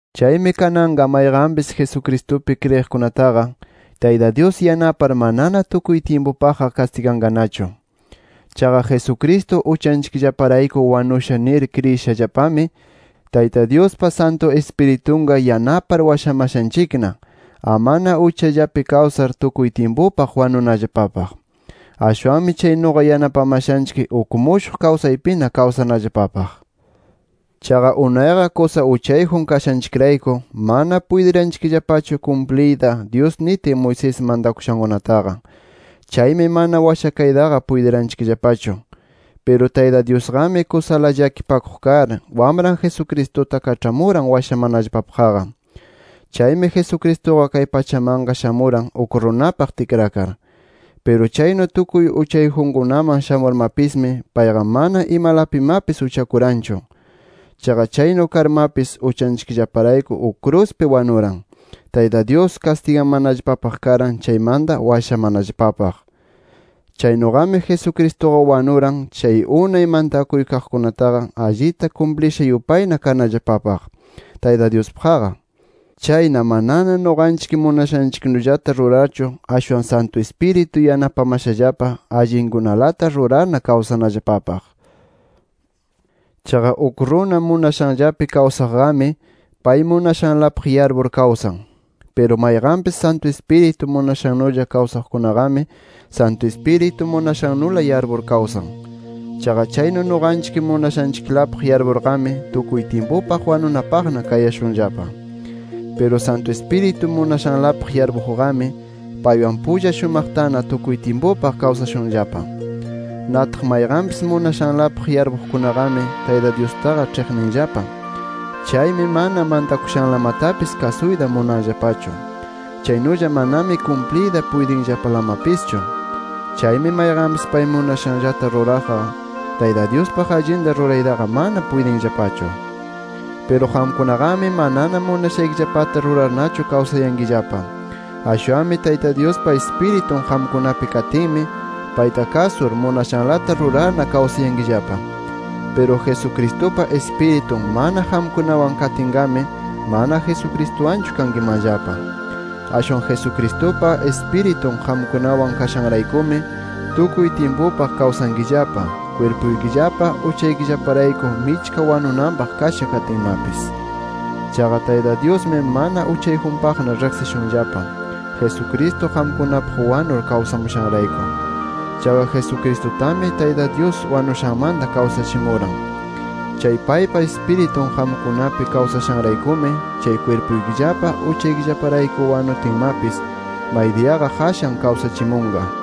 Chaymi kananqa mayqanpis, Jesucristupi kriyiqkunataqa Tayta Dyus yanapar manana tukuy tyimpupaqqa kastiganqanachu. Chaqa Jesucristo uchanchikllaparayku wanusha nir kriyishallapami, Tayta Dyuspa Santu Ispiritunqa yanapar washamashanchikna, amana uchallapi kawsar tukuy tyimpupaq wanunallapapaq. Ashwanmi chaynuqa yanapamashanchik uk mushuq kawsaypina kawsanallapapaq. Chaqa unayqa kusa uchayjun kashanchikrayku, mana puytiranchikllapachu kumpliyta Dyus nitin Moisés mantakushankunataqa. Chaymi mana washakaytaqa puytiranchikllapachu. Piru Tayta Dyusqami kusala llakipakuq kar, Wamran Jesucristuta kaĉhamuran washamanallapapaqqa. Chaymi Jesucristuqa kay pachamanqa shamuran uk runapaq tikrakar. Piru chaynu tukuy uchayjunkunaman shamurmapismi payqa mana imalapimapis uchakuranchu. Chaqa chaynu karmapis uchanchikllaparayku uk kruspi wanuran, Tayta Dyus kastigamanallapapaq karan chaymanta washamanallapapaq. Chaynuqami Jesucristuqa wanuran, chay unay mantakuy kaqkunataqa allita kumplisha yupayna kanallapapaq Tayta Dyuspaqqa. Chayna manana nuqanchik munashanchiknullata rurarchu, ashwan Santu Ispiritun yanapamashallapa allinkunalata rurarna kawsanallapapaq. Chaqa uk runa munashanllapi kawsaqqami, pay munashanlapaq yarpur kawsan. Piru mayqanpis Santu Ispiritu munashannulla kawsaqkunaqami, Santu Ispiritu munashannula yarpur kawsan. Chaqa chaynu nuqanchik munashanchiklapaq yarpurqami, tukuy tyimpupaq wanunapaqna kayashunllapa. Piru Santu Ispiritu munashanlapaq yarpuqqami, paywan pulla shumaqtana tukuy tyimpupaq kawsashunllapa. Nataq mayqanpis munashanlapaq yarpuqkunaqami, Tayta Dyustaqa ĉhiqninllapa. Chaymi mana mantakushanlamatapis kasuyta munanllapachu. Chaynulla manami kumpliyta puytinllapalamapischu. Chaymi mayqanpis pay munashanllata ruraqqa, Tayta Dyuspaq allinta ruraytaqa mana puytinllapachu. Piru qamkunaqami manana munashaykillapata rurarnachu kawsayankillapa. Ashwanmi Tayta Dyuspa Ispiritun qamkunapi katinmi, payta kasur munashanlata rurarna kawsayankillapa. Piru Jesucristupa Ispiritun mana qamkunawan katinqami, mana Jesucristuwanchu kankimanllapa. Ashwan Jesucristupa Ispiritun qamkunawan kashanraykumi tukuy tyimpupaq kawsankillapa, kwirpuykillapa uchaykillaparayku michka wanunanpaq kasha katinmapis. Chaqa Tayta Dyusmi mana uchayjunpaqna riqsishunllapa, Jesucristo qamkunapaq wanur kawsamushanrayku. Chaqa Jesucristutami, Tayta Dyus wanushanmanta kawsachimuran. Chay paypa Ispiritun qamkunapi kawsashanraykumi, chay kwirpuykillapa uchaykillaparayku wanutinmapis, maydiyaqa qashan kawsachimunqa.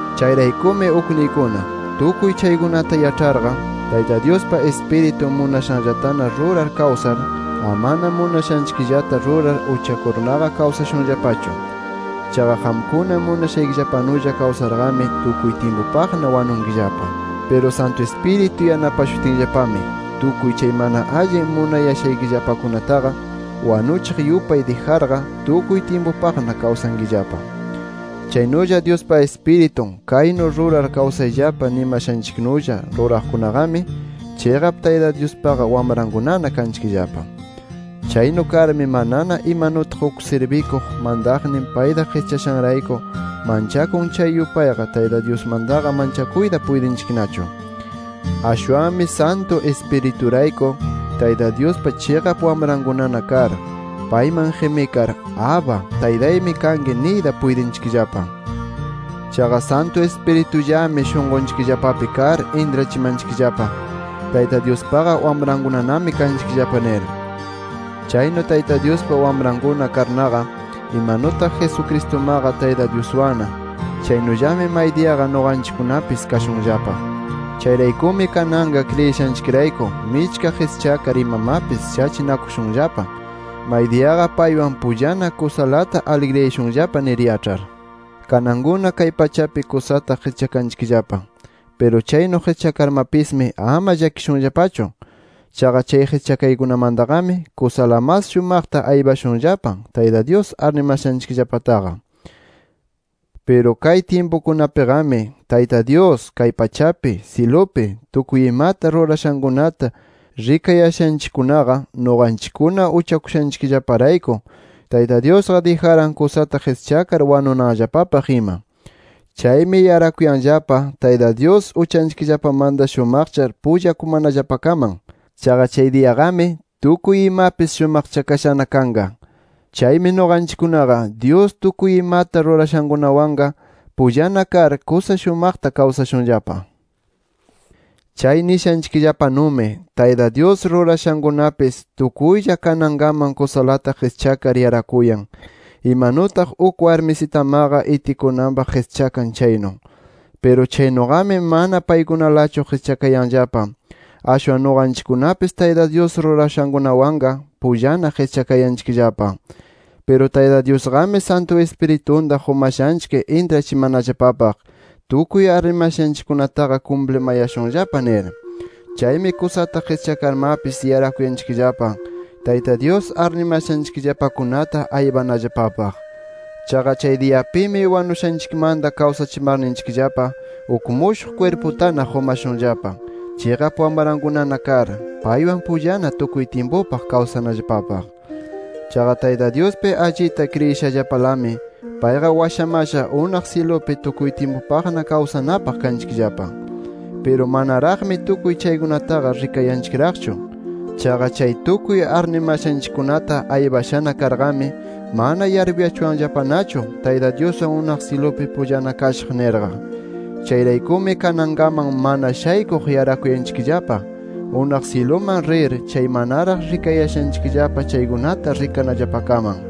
Chayraykumi ukniykuna tukuy chaykunata yaĉharqa, Tayta Dyuspa Ispiritun munashanllatana rurar kawsar, amana munashanchikllata rurar uchakurnaqa kawsashunllapachu. Chaqa qamkuna munashaykillapanulla kawsarqami, tukuy tyimpupaqna wanunkillapa. Piru Santu Ispiritu yanapashutinllapami, tukuy chay mana allin munayashaykillapakunataqa wanuchiq yupay dijarqa, tukuy tyimpupaqna kawsankillapa. Chaynulla Dyuspa Ispiritun kaynu rurar kawsayllapa nimashanchiknulla ruraqkunaqami, chiqap Tayta Dyuspaqa wamrankunana kanchikllapa. Chaynu karmi manana, imanutaq uk sirbikuq mantaqnin payta qischashanrayku manchakun chay yupayqa Tayta Dyusmantaqa manchakuyta puytinchiknachu. Ashwanmi Santu Ispiriturayku, Tayta Dyuspa chiqap wamrankunana kar payman qimikar “Abba, Taytaymi kanki” niyta puytinchikllapa. Chaqa Santu Ispiritullami shunqunchikllapapi kar intrachimanchikllapa, Tayta Dyuspaqa wamrankunanami kanchikllapa nir. Chaynu Tayta Dyuspa wamrankuna karnaqa, imanutaq Jesucristumaqa Tayta Dyuswanna, chaynullami maydiyaqa nuqanchikkunapis kashunllapa. Chayraykumi kananqa kriyishanchikrayku michka qischakar imamapis shachinakushunllapa, maydiyaqa paywan pullana kusalata aligriyashunllapa nir yaĉhar. Kanankuna kay pachapi kusata qischakanchikllapa. Piru chaynu qischakarmapismi ama llakishunllapachu. Chaqa chay qischakaykunamantaqami, kusala mas shumaqta aypashunllapa Tayta Dyus arnimashanchikllapataqa. Piru kay tyimpukunapiqami Tayta Dyus kay pachapi, syilupi tukuy imata rurashankunata rikayashanchikkunaqa, nuqanchikkuna uchakushanchikllaparayku, Tayta Dyusqa dijaran kusata qischakar wanunanllapapaq ima. Chaymi yarakuyanllapa, Tayta Dyus uchanchikllapamanta shumaqchar pullakumanallapakaman. Chaqa chay diyaqami, tukuy imapis shumaqchakashana kanqa. Chaymi nuqanchikkunaqa, Dyus tukuy imata rurashankunawanqa, pullana kar kusa shumaqta kawsashunllapa. Chay nishanchikllapanumi, Tayta Dyus rurashankunapis tukuylla kanankaman kusalata qischakar yarakuyan, imanutaq uk warmisitamaqa itikunanpaq qischakan chaynu. Piru chaynuqami mana paykunalachu qischakayanllapa. Ashwan nuqanchikkunapis Tayta Dyus rurashankunawanqa, pullana qischakayanchikllapa. Piru Tayta Dyusqami Santu Ispiritunta qumashanchik intrachimanallapapaq, tukuy arnimashanchikkunataqa kumplimayashunllapa nir. Chaymi kusata qischakarmapis, yarakuyanchikllapa Tayta Dyus arnimashanchikllapakunata aypanallapapaq. Chaqa chay diyapimi wanushanchikmanta kawsachimarninchikllapa, uk mushuq kwirputana qumashunllapa, chiqap wamrankunana kar, paywan pullana tukuy tyimpupaq kawsanallapapaq. Chaqa Tayta Dyuspi allita kriyishallapalami, payqa washamasha unaq syilupi tukuy tyimpupaqna kawsanapaq kanchikllapa. Piru manaraqmi tukuy chaykunataqa rikayanchikraqchu. Chaqa chay tukuy arnimashanchikkunata aypashana karqami, mana yarpuyachuwanllapanachu Tayta Dyuswan unaq syilupi pullana kashaq nirqa. Chayraykumi kanankaman mana shaykuq yarakuyanchikllapa, unaq syiluman rir chay manaraq rikayashanchikllapa chaykunata rikanallapakaman.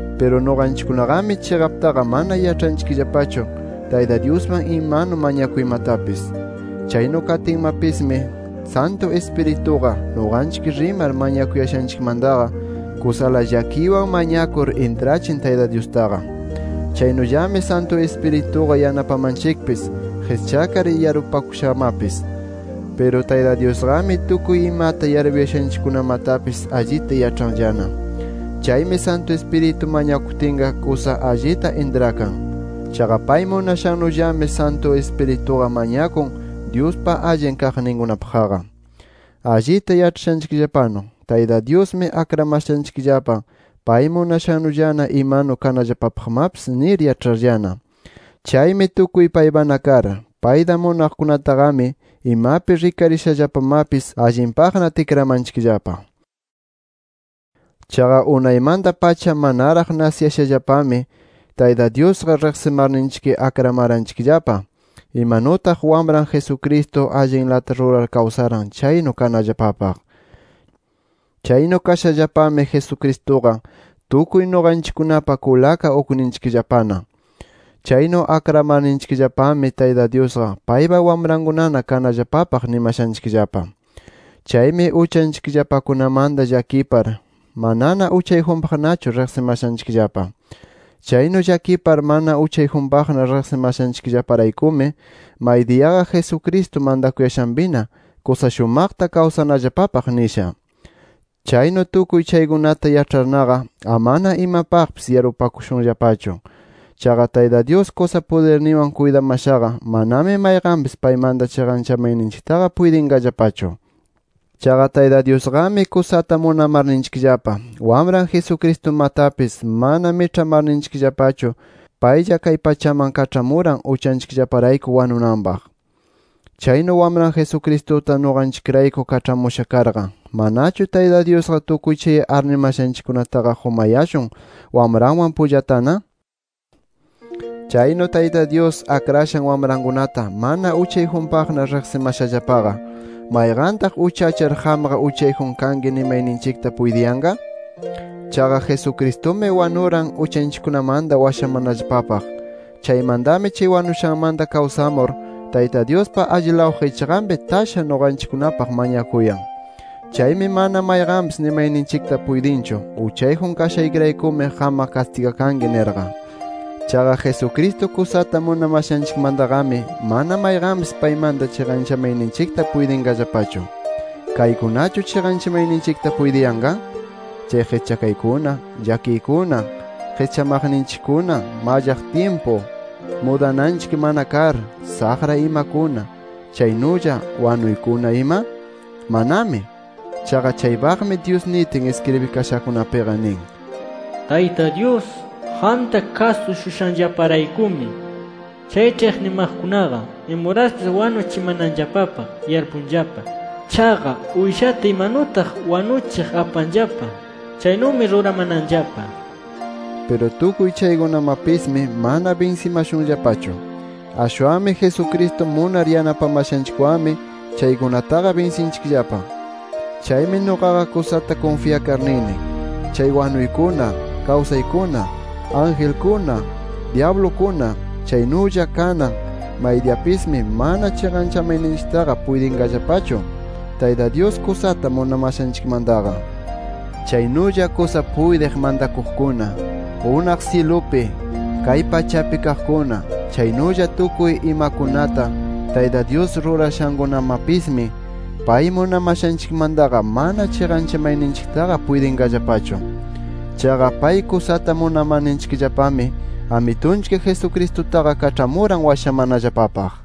Piru nuqanchikkunaqami, chiqaptaqa mana yaĉhanchikllapachu, Tayta Dyusman imanu mañakuymatapis. Chaynu katinmapismi, Santu Ispirituqa nuqanchik rimar mañakuyashanchikmantaqa, kusala llakiywan mañakur intrachin Tayta Dyustaqa. Chaynullami Santu Ispirituqa yanapamanchikpis qischakar yarpupakushamapis. Piru Tayta Dyusqami tukuy imata yarpuyashanchikkunamatapis allita yaĉhanllana. Chaymi Santu Ispiritu mañakutinqa kusa allita intrakan. Chaqa pay munashannullami, Santu Ispirituqa mañakun Dyuspa allin kaqninkunapaqqa. Allita yaĉhashanchikllapanu, Tayta Dyusmi akramashanchikllapa pay munashannulla, imanu kanallapapaqmapis nir yaĉharllana. Chaymi tukuy paypana kar, payta munaqkunataqami imapi rikarishallapamapis allinpaqna tikramanchikllapa. Chaqa unaymanta-pacha manaraq nasiyashallapami, Tayta Dyusqa riqsimarninchik akramaranchikllapa imanutaq Wamran Jesucristo allinlata rurar kawsaran chaynu kanallapapaq. Chaynu kashallapami, Jesucristuqa tukuy nuqanchikkunapa kulaka ukninchikllapana. Chaynu akramarninchikllapami, Tayta Dyusqa paypa wamrankunana kanallapapaq nimashanchikllapa. Chaymi uchanchikllapakunamanta llakipar, manana uchayjunpaqnachu riqsimashanchikllapa. Chaynu llakipar mana uchayjunpaqna riqsimashanchikllaparaykumi, maydiyaqa Jesucristo mantakuyashanpina, kusa shumaqta kawsanallapapaq nisha. Chaynu tukuy chaykunata yaĉharnaqa, ¡amana imapaqpis yarpupakushunllapachu! Chaqa Tayta Dyus kusa pudirninwan kuytamashaqa, manami mayqanpis paymanta chiqanchamayninchiktaqa puytinqallapachu. Chaqa Tayta Dyusqami kusata munamarninchikllapa, Wamran Jesucristumatapis mana miĉhamarninchikllapachu, paylla kay pachaman kaĉhamuran uchanchikllaparayku wanunanpaq. Chaynu Wamran Jesucristuta nuqanchikrayku kaĉhamusha karqa, ¿manachu Tayta Dyusqa tukuy chay arnimashanchikkunataqa qumayashun Wamranwan pullatana? Chaynu Tayta Dyus akrashan wamrankunata mana uchayjunpaqna riqsimashallapaqa, ¿mayqantaq uchachar, qamqa uchayjun kanki nimayninchikta puytiyanqa? Chaqa Jesucristumi wanuran, uchanchikkunamanta washamanallapapaq. Chaymantami chay wanushanmanta kawsamur, Tayta Dyuspa allilaw qichqanpi tasha nuqanchikkunapaq mañakuyan. Chaymi mana mayqanpis nimayninchikta puytinchu: “Uchayjun kashaykiraykumi qamqa kastigakanki” nirqa. Chaqa Jesucristo kusata munamashanchikmantaqami, mana mayqanpis paymanta chiqanchamayninchikta puytinqallapachu. ¿Kaykunachu chiqanchamayninchikta puytiyanqa? ¿Chay qischakaykuna, llakiykuna, qischamaqninchikkuna, mallaq tyimpu, mudananchik mana kar, saqra imakuna, chaynulla wanuykuna ima? ¡Manami! Chaqa chaypaqmi Dyus nitin iskribikashakunapiqa nin: “Tayta Dyus, qamta kasushushayllaparaykumi, chay ĉhiqnimaqkunaqa imuraspis wanuchimananllapapaq yarpunllapa. Chaqa uyshata imanutaq wanuchiq apanllapa, chaynumi ruramananllapa” nir. Piru tukuy chaykunamapismi, mana binsimashunllapachu. Ashwanmi Jesucristo munar yanapamashanchikwanmi chaykunataqa binsinchikllapa. Chaymi nuqaqa kusata kunfyakar nini: Chay wanuykuna, kawsaykuna, angelkuna, dyablukuna, chaynulla kanan, maydiyapismi mana chiqanchamayninchiktaqa puytinqallapachu Tayta Dyus kusata munamashanchikmantaqa. Chaynulla kusa puytiq mantakuqkuna, unaq syilupi, kay pachapi kaqkuna, chaynulla tukuy imakunata Tayta Dyus rurashankunamapismi, pay munamashanchikmantaqa mana chiqanchamayninchiktaqa puytinqallapachu. Chaqa pay kusata munamarninchikllapami, Amitunchik Jesucristutaqa kaĉhamuran washamanallapapaq.